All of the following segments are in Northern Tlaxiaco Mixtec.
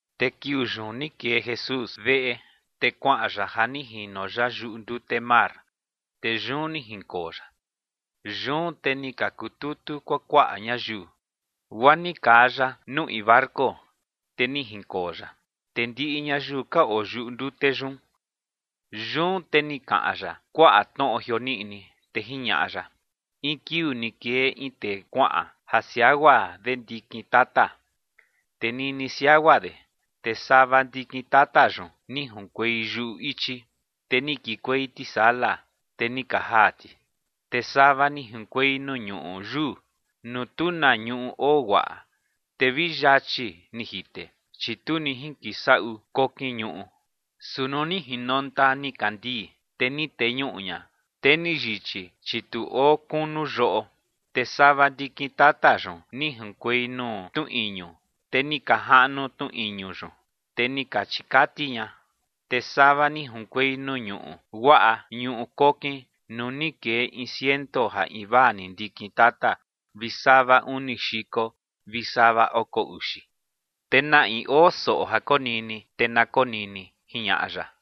Te kiuu yun ni kee Jesús veꞌe, te kuaꞌan ya ja ni jino ya yuꞌu ndute mar, te yun ni jinkoo ya. Yun te ni ka kututu kuakuaꞌa ñayiu, guaa ni kaa ya nuu in barco, te ni jinkoo ya. Te ndiꞌi ñayiu ka oo yuꞌu ndute yun. Yun te ni kaꞌan ya kuaꞌa tnoꞌo jioniꞌni, te jiñaꞌa ya: ͏―͏In kiuu ni kee in tee kuaꞌan ja siagua de ndikin tata. Te nini siagua de, te sava ndikin tata yun ni junkuei yuꞌu ichi, te ni kikuei tisala, te ni ka jaa ti. Te sava ni junkuei nuu ñuꞌu yuu, nuu tu na ñuꞌu oo guaꞌa, te vi yachi ni jite, chi tu ni jinkisaꞌu kokin ñuꞌu. Su nuu ni jinonta nikandii, te ni teñuꞌu ña, te ni yichi, chi tu oo kunu yoꞌo. Te sava ndikin tata yun ni junkuei nuu tnu iñu, te ni ka jaꞌnu tnu iñu yun, te ni ka chikati ña. Te sava ni junkuei nuu ñuꞌu guaꞌa ñuꞌu kokin nuu ni kee in ciento ja invaa ndikin tata vi sava uni xiko vi sava oko uxi. Te na in oo soꞌo ja konini, te na konini ͏―͏jiñaꞌa ya.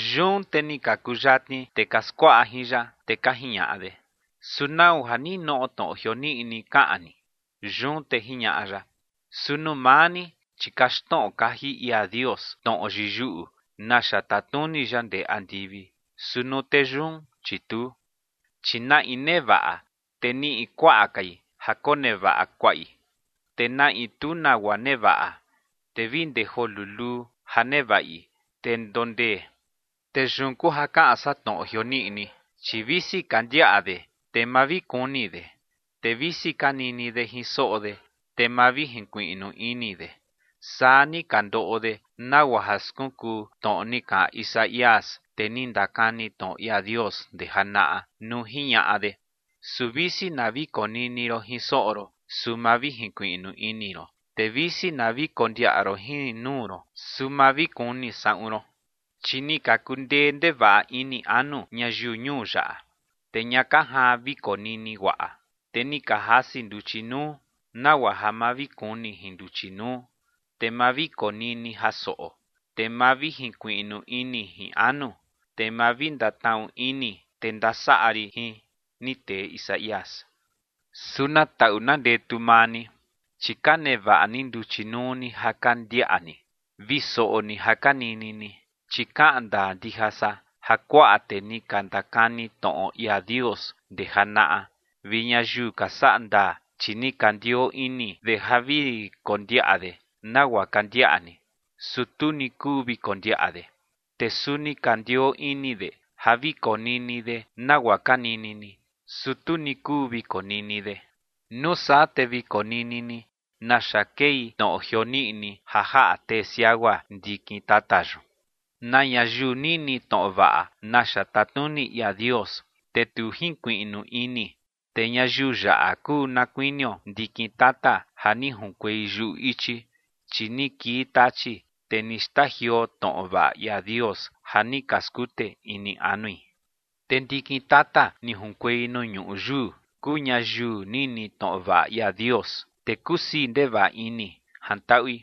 Yun te ni ka kuyatni tee ka skuaꞌa jin ya, te ka jiñaꞌa de: ͏―͏¿Su nau ja ninoꞌo tnoꞌo jioniꞌni kaꞌan ni? Yun te jiñaꞌa ya: ͏―͏Su nuu maa ni, chi kaxtnoꞌo kaji ia Dios tnoꞌo yiyuꞌu naxa tatnuni ya ndee andivi, su nuu tee yun, chi tuu. Chi na in nevaꞌa, te niꞌi kuaꞌa kai ja konevaꞌa kuaꞌi. Te na in tu nagua nevaꞌa, te vi ndee joo luluu ja nevaꞌi, te ndondee. Te yun kuu ja kaꞌan san tnoꞌo jioniꞌni. Chi visi ka ndiaꞌa de te ma vi kuni de, te visi ka nini de jin soꞌo de, te ma vi jinkuiꞌnu ini de. Saa ni ka ndoꞌo de, nagua ja skunkuu tnoꞌo ni kaꞌan Isaías, tee ni ndakani tnoꞌo ia Dios ndee janaꞌa, nuu jiñaꞌa de: Su visi na vi konini ron jin soꞌo ron, su ma vi jinkuiꞌnu ini ron. Te visi na vi kondiaꞌa ron jin nuu ron, su ma vi kuni saꞌun ron. Chi ni ka kundee ndevaꞌa ini anu ñayiu ñuu yaꞌa, te ña ka jaan vi konini guaꞌa, te ni ka jasi nduchi nuu, nagua ja ma vi kuni jin nduchi nuu, te ma vi konini jin soꞌo, te ma vi jinkuiꞌnu ini jin anu, te ma vi ndatnaꞌu ini te ndasaꞌa rin jin. Ni tee Isaías. ’Su na taꞌu na ndetu maa ni, chi ka nevaꞌa ni nduchi nuu ni ja ka ndiaꞌa ni, vi soꞌo ni ja ka nini ni. Chi kaꞌan ndaa ndija san ja kuaꞌa tee ni ka ndakani tnoꞌo ia Dios ndee janaꞌa vi ñayiu ka saꞌa ndaa, chi ni ka ndioo ini de ja vi kondiaꞌa de nagua ka ndiaꞌa ni, su tu ni kuu vi kondiaꞌa de. Te suni ka ndioo ini de ja vi konini de nagua ka nini ni, su tu ni kuu vi konini de. ’Nuu saa te vi konini ni naxa kei tnoꞌo jioniꞌni ja jaꞌa tee siagua ndikin tata yun. Na ñayiu nini tnoꞌo vaꞌa naxa tatnuni ia Dios, te tu jinkuiꞌnu ini, te ñayiu yaꞌa kuu na kuinio ndikin tata ja ni junkuei yuꞌu ichi. Chi ni kii Tachi, te ni xtajioo tnoꞌo vaꞌa ia Dios ja ni ka skute ini anui. Te ndikin tata ni junkuei nuu ñuꞌu yuu, kuu ñayiu nini tnoꞌo vaꞌa ia Dios, te kusii ndevaꞌa ini jantaꞌui.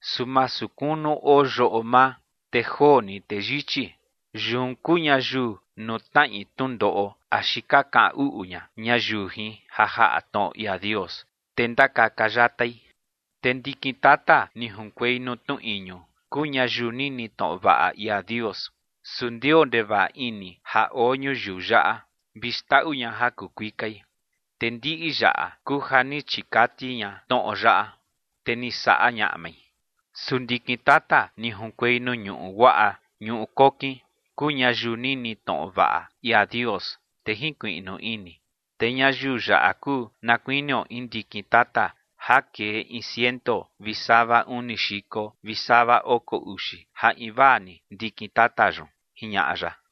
Su masu kunu oo yoꞌo maa, te joo ni te yichi. Yun kuu ñayiu nuu tnaꞌi tnundoꞌo axi ka kaꞌan uꞌu ña ñayiu jin ja jaꞌa tnoꞌo ia Dios, te ndakaka yatai. Te ndikin tata ni junkuei nuu tnu iñu, kuu ñayiu nini tnoꞌo vaꞌa ia Dios, su ndioo ndevaꞌa ini ja oo ñuyiu yaꞌa vi xndaꞌu ña ja kuu kuikai. Te ndiꞌi yaꞌa kuu ja ni chikati ña tnoꞌo yaꞌa, te ni saꞌa ñaꞌmai. Su ndikin tata ni junkuei nuu ñuꞌu guaꞌa ñuꞌu kokin, kuu ñayiu nini tnoꞌo vaꞌa ia Dios, te jinkuiꞌnu ini. Te ñayiu yaꞌa kuu na kuinio in ndikin tata ja kee in ciento vi sava uni xiko vi sava oko uxi ja invaa ni ndikin tata yun ͏―͏jiñaꞌa ya.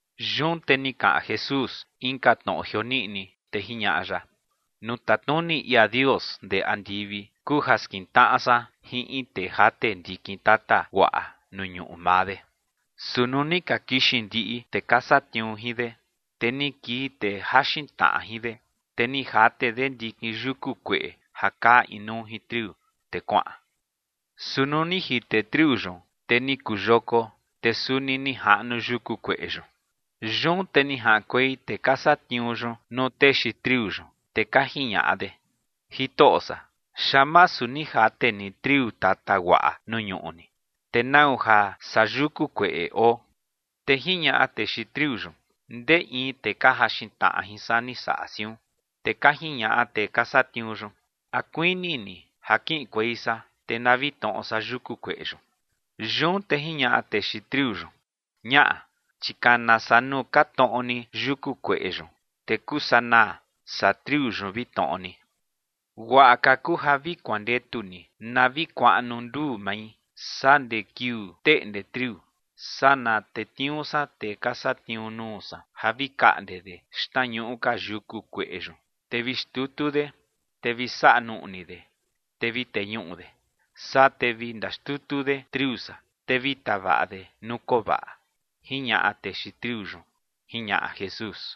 Yun te ni kaꞌan Jesús inka tnoꞌo jioniꞌni, te jiñaꞌa ya: ͏―͏Nuu tatnuni ia Dios ndee andivi kuu ja skintnaꞌa san jin in tee jate ndikin tata guaꞌa nuu ñuꞌu maa de. Su nuu ni ka kixin ndiꞌi tee ka satniuu jin de, te ni kii tee jaxin tnaꞌa jin de, te ni jate de ndikin yuku kueꞌe ja kaa inuu jin triu, te kuaꞌan. Su nuu ni jite triu yun, te ni kuu yoko, te suni ni jaꞌnu yuku kueꞌe yun. Yun te ni jaꞌankuei tee ka satniuu yun nuu tee xiin triu yun, te ka jiñaꞌa de: “Jitoꞌo san, ¿xaan masu ni jate ni triu tata guaꞌa nuu ñuꞌu ni? ¿Te nau ja saa yuku kueꞌe oo?” Te jiñaꞌa tee xiin triu yun: “Ndee in tee ka jaxin tnaꞌa jin san ni saꞌa siun”. Te ka jiñaꞌa tee ka satniuu yun: “¿A kuini ni ja kiꞌinkuei san, te na vi tnoꞌo san yuku kueꞌe yun?” Yun te jiñaꞌa tee xiin triu yun: “Ñaꞌa, chi kana saa nuu ka tnoꞌo ni yuku kueꞌe yun, te kuu sanaa saa triu yun vi tnoꞌo ni. Guaꞌa ka kuu ja vi kuandetu ni na vi kuaꞌnu nduu mai saa ndee kiuu teꞌnde triu, saa na tetniuu san tee ka satniuu nuu san ja vi kaꞌnde de xtnañuꞌu ka yuku kueꞌe yun, te vi xtutu de, te vi saꞌa nuꞌni de, te vi teñuꞌu de. Saa te vi ndaxtutu de triu san, te vi tavaꞌa de nuu koo vaꞌa”, jiñaꞌa tee xiin triu yun ͏―͏jiñaꞌa Jesús.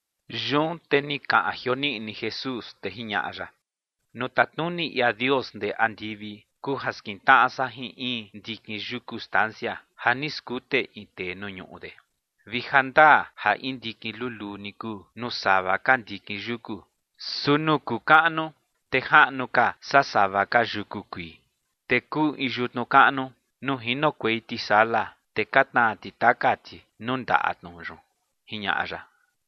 Yun te ni kaꞌan jioniꞌni Jesús, te jiñaꞌa ya: ͏―͏Nuu tatnuni ia Dios ndee andivi kuu ja skintnaꞌa san jin in ndikin yuku stansia ja ni skute in tee nuu ñuꞌu de. Vi ja ndaa ja in ndikin luluu ni kuu nuu sava ka ndikin yuku. Su nuu kuu kaꞌnu, te jaꞌnu ka saa sava ka yuku kuii. Te kuu in yutnu kaꞌnu nuu jinokuei tisala, te ka tnaa ti taka ti nuu ndaꞌa tnu yun ͏―͏jiñaꞌa ya.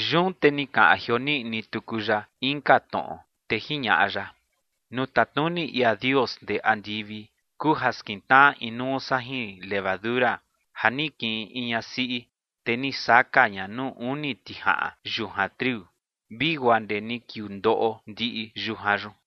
Yun te ni kaꞌan jioniꞌni tuku ya inka tnoꞌo, te jiñaꞌa ya: ͏―͏Nuu tatnuni ia Dios ndee andivi kuu ja skintnaꞌa inuu san jin levadura ja ni kiꞌin in ñasiꞌi, te ni saka ña nuu uni tijaꞌan yujan triu, vi guaa ndee ni kiuu ndoꞌo ndiꞌi yujan yun.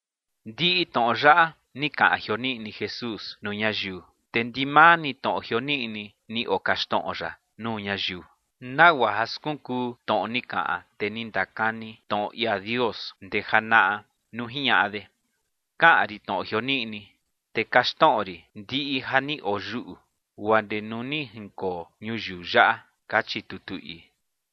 Ndiꞌi tnoꞌo yaꞌa ni kaꞌan jioniꞌni Jesús nuu ñayiu. Te ndimaa ni tnoꞌo jioniꞌni ni okaxtnoꞌo ya nuu ñayiu, nagua ja skunkuu tnoꞌo ni kaꞌan tee ni ndakani tnoꞌo ia Dios ndee janaꞌa nuu jiñaꞌa de: Kaꞌan rin tnoꞌo jioniꞌni, te kaxtnoꞌo rin ndiꞌi ja ni oyuꞌu, guaa ndee nuu ni jinkoo ñuyiu yaꞌa, kachi tutu ii.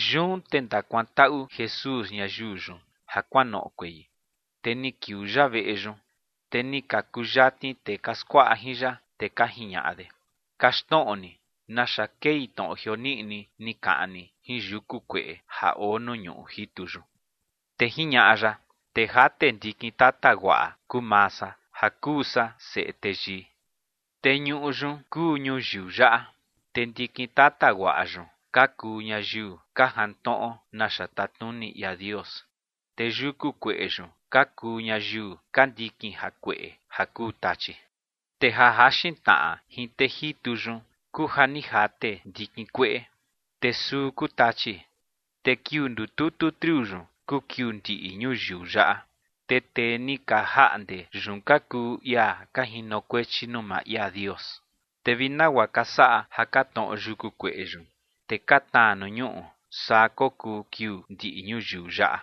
Yun te ni ndakuantaꞌu Jesús ñayiu yun ja kuanoꞌokuei, te ni kiuu ya veꞌe yun. Te ni ka kuyatni tee ka skuaꞌa jin ya, te ka jiñaꞌa de: ͏―͏Kaxtnoꞌo ni naxa kei tnoꞌo jioniꞌni ni kaꞌan ni jin yuku kueꞌe ja oo nuu ñuꞌu jitu yun. Te jiñaꞌa ya: ͏―͏Tee jate ndikin tata guaꞌa kuu maa san ja kuu san Seꞌe Teyii. Te ñuꞌu yun kuu ñuyiu yaꞌa. Te ndikin tata guaꞌa yun ka kuu ñayiu ka jantnoꞌo naxa tatnuni ia Dios. Te yuku kueꞌe yun ka kuu ñayiu ka ndikin jakueꞌe ja kuu Tachi. Te ja jaxin tnaꞌa jin tee jitu yun, kuu ja ni jate ndikin kueꞌe, te suu kuu Tachi. Te kiuu ndututu triu yun kuu kiuu ndiꞌi ñuyiu yaꞌa. Te tee ni ka jaꞌnde yun ka kuu ia ka jinokuechi nuu maa ia Dios. Te vi nagua ka saꞌa ja ka tnoꞌo yuku kueꞌe yun, te ka tnaa nuu ñuꞌu, saa kokuu kiuu ndiꞌi ñuyiu yaꞌa.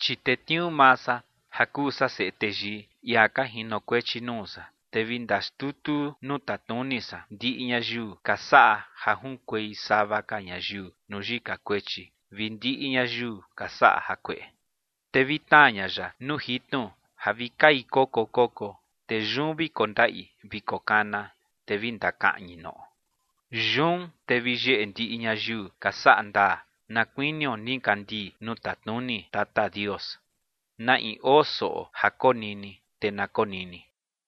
Chi tetniuu maa san ja kuu san Seꞌe Teyii, ia ka jinokuechi nuu san, te vi ndaxtutu nuu tatnuni san ndiꞌi ñayiu ka saꞌa ja junkuei sava ka ñayiu nuu yika kuechi vi ndiꞌi ñayiu ka saꞌa jakueꞌe. Te vi tnaa ña ya nuu jitnu ja vi kai koko koko. Te yun vi kondaꞌi vi kokana, te vi ndakaꞌñi noꞌo. Yun te vi yeꞌe ndiꞌi ñayiu ka saꞌa ndaa, na kuinio nikandii nuu tatnuni Tata Dios. Na in oo soꞌo ja konini, te na konini.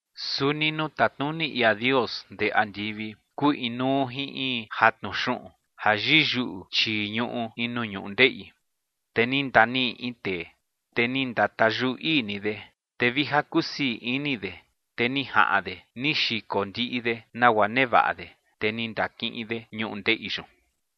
’Suni nuu tatnuni ia Dios ndee andivi kuu inuu jin in jatnu xuꞌun ja yiyuꞌu chii ñuꞌu in nuu ñundeꞌi. Te ni ndaniꞌi in tee, te ni ndatayuꞌu ii ni de. Te vi ja kusii ini de, te ni jaꞌan de ni xiko ndiꞌi de nagua nevaꞌa de, te ni ndakiꞌin de ñundeꞌi yun.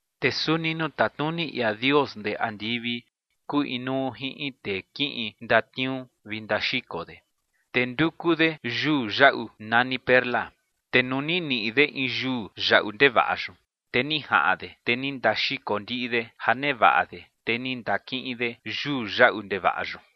’Te suni nuu tatnuni ia Dios ndee andivi kuu inuu jin in tee kiꞌin ndatniuu vi ndaxiko de, te nduku de yuu yaꞌu nani perla. Te nuu ni niꞌi de in yuu yaꞌu ndevaꞌa yun, te ni jaꞌan de, te ni ndaxiko ndiꞌi de ja nevaꞌa de, te ni ndakiꞌin de yuu yaꞌu ndevaꞌa yun.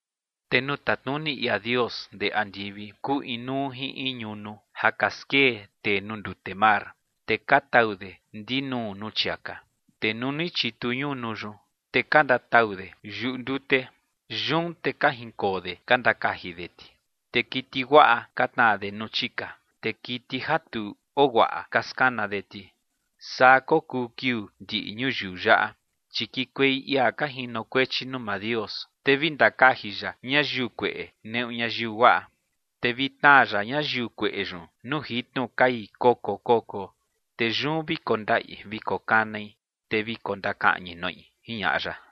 ’Te nuu tatnuni ia Dios ndee andivi kuu inuu jin in ñunu ja ka skee tee nuu ndute mar, te ka tau de ndinuu nuu chiaka. Te nuu ni chitu ñunu yun, te ka ndatau de yuꞌu ndute. Yun te ka jinkoo de ka ndakaji de ti. Te kiti guaꞌa ka tnaa de nuu chika, te kiti ja tu oo guaꞌa, ka skana de ti. Saa kokuu kiuu ndiꞌi ñuyiu yaꞌa. Chi kikuei ia ka jinokuechi nuu maa Dios, te vi ndakaji ya ñayiu kueꞌe neꞌu ñayiu guaꞌa. Te vi tnaa ya ñayiu kueꞌe yun nuu jitnu kai koko koko, te yun vi kondaꞌi vi kokanai, te vi kondakaꞌñi noꞌi ͏―͏jiñaꞌa ya.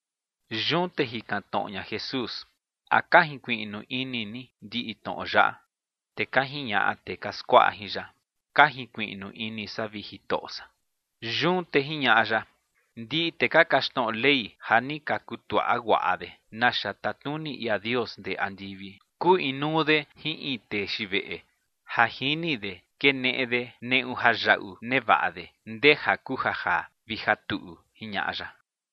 Yun te jikan tnoꞌo ña Jesús: ͏―͏¿A ka jinkuiꞌnu ini ni ndiꞌi tnoꞌo yaꞌa? Te ka jiñaꞌa tee ka skuaꞌa jin ya: ͏―͏Ka jinkuiꞌnu ini san, vi Jitoꞌo san. Yun te jiñaꞌa ya: ͏―͏Ndiꞌi tee ka kaxtnoꞌo Ley ja ni ka kutuaꞌa guaꞌa de naxa tatnuni ia Dios ndee andivi, kuu inuu de jin in tee xiin veꞌe ja jini de keneꞌe de neꞌu jayaꞌu nevaꞌa de ndeja kuu ja jaa vi ja tuꞌu ͏―͏jiñaꞌa ya.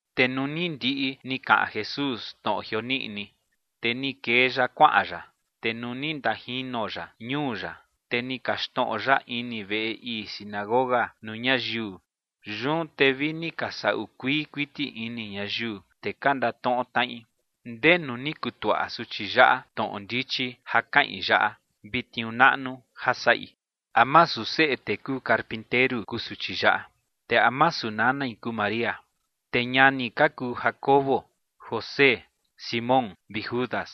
Te nuu ni ndiꞌi ni kaꞌan Jesús tnoꞌo jioniꞌni, te ni kee ya kuaꞌan ya. Te nuu ni ndajino ya ñuu ya, te ni kaxtnoꞌo ya ini veꞌe ii sinagoga nuu ñayiu. Yun te vi ni ka saꞌu kuii kuiti ini ñayiu, te ka ndatnoꞌo tnaꞌi: ͏―͏¿Ndenu ni kutuaꞌa suchi yaꞌa tnoꞌo ndichi ja kaꞌin yaꞌa vi tniuu naꞌnu ja saꞌi? ¿A masu seꞌe tee kuu carpinteru kuu suchi yaꞌa? Te ¿a masu nanai kuu María? Te ñani ka kuu Jacobo, José, Simón vi Judas.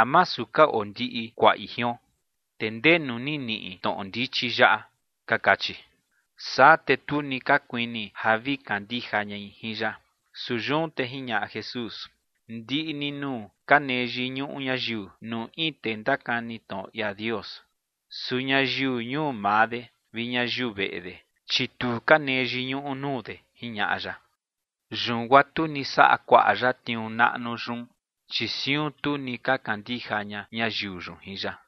¿A masu ka oo ndiꞌi kuaꞌi jion? Te ¿ndenu ni niꞌi tnoꞌo ndichi yaꞌa? ͏―͏ka kachi. Saa te tu ni ka kuini ja vi kandija ñai jin ya. Su yun te jiñaꞌa Jesús: ͏―͏Ndiꞌi ni nuu ka nee yiñuꞌu ñayiu nuu in tee ndakani tnoꞌo ia Dios. Su ñayiu ñuu maa de vi ñayiu veꞌe de, chi tu ka nee yiñuꞌu nuu de ͏―͏jiñaꞌa ya. Yun guaa tu ni saꞌa kuaꞌa ya tniuu naꞌnu yun, chi siun tu ni ka kandija ña ñayiu yun jin ya.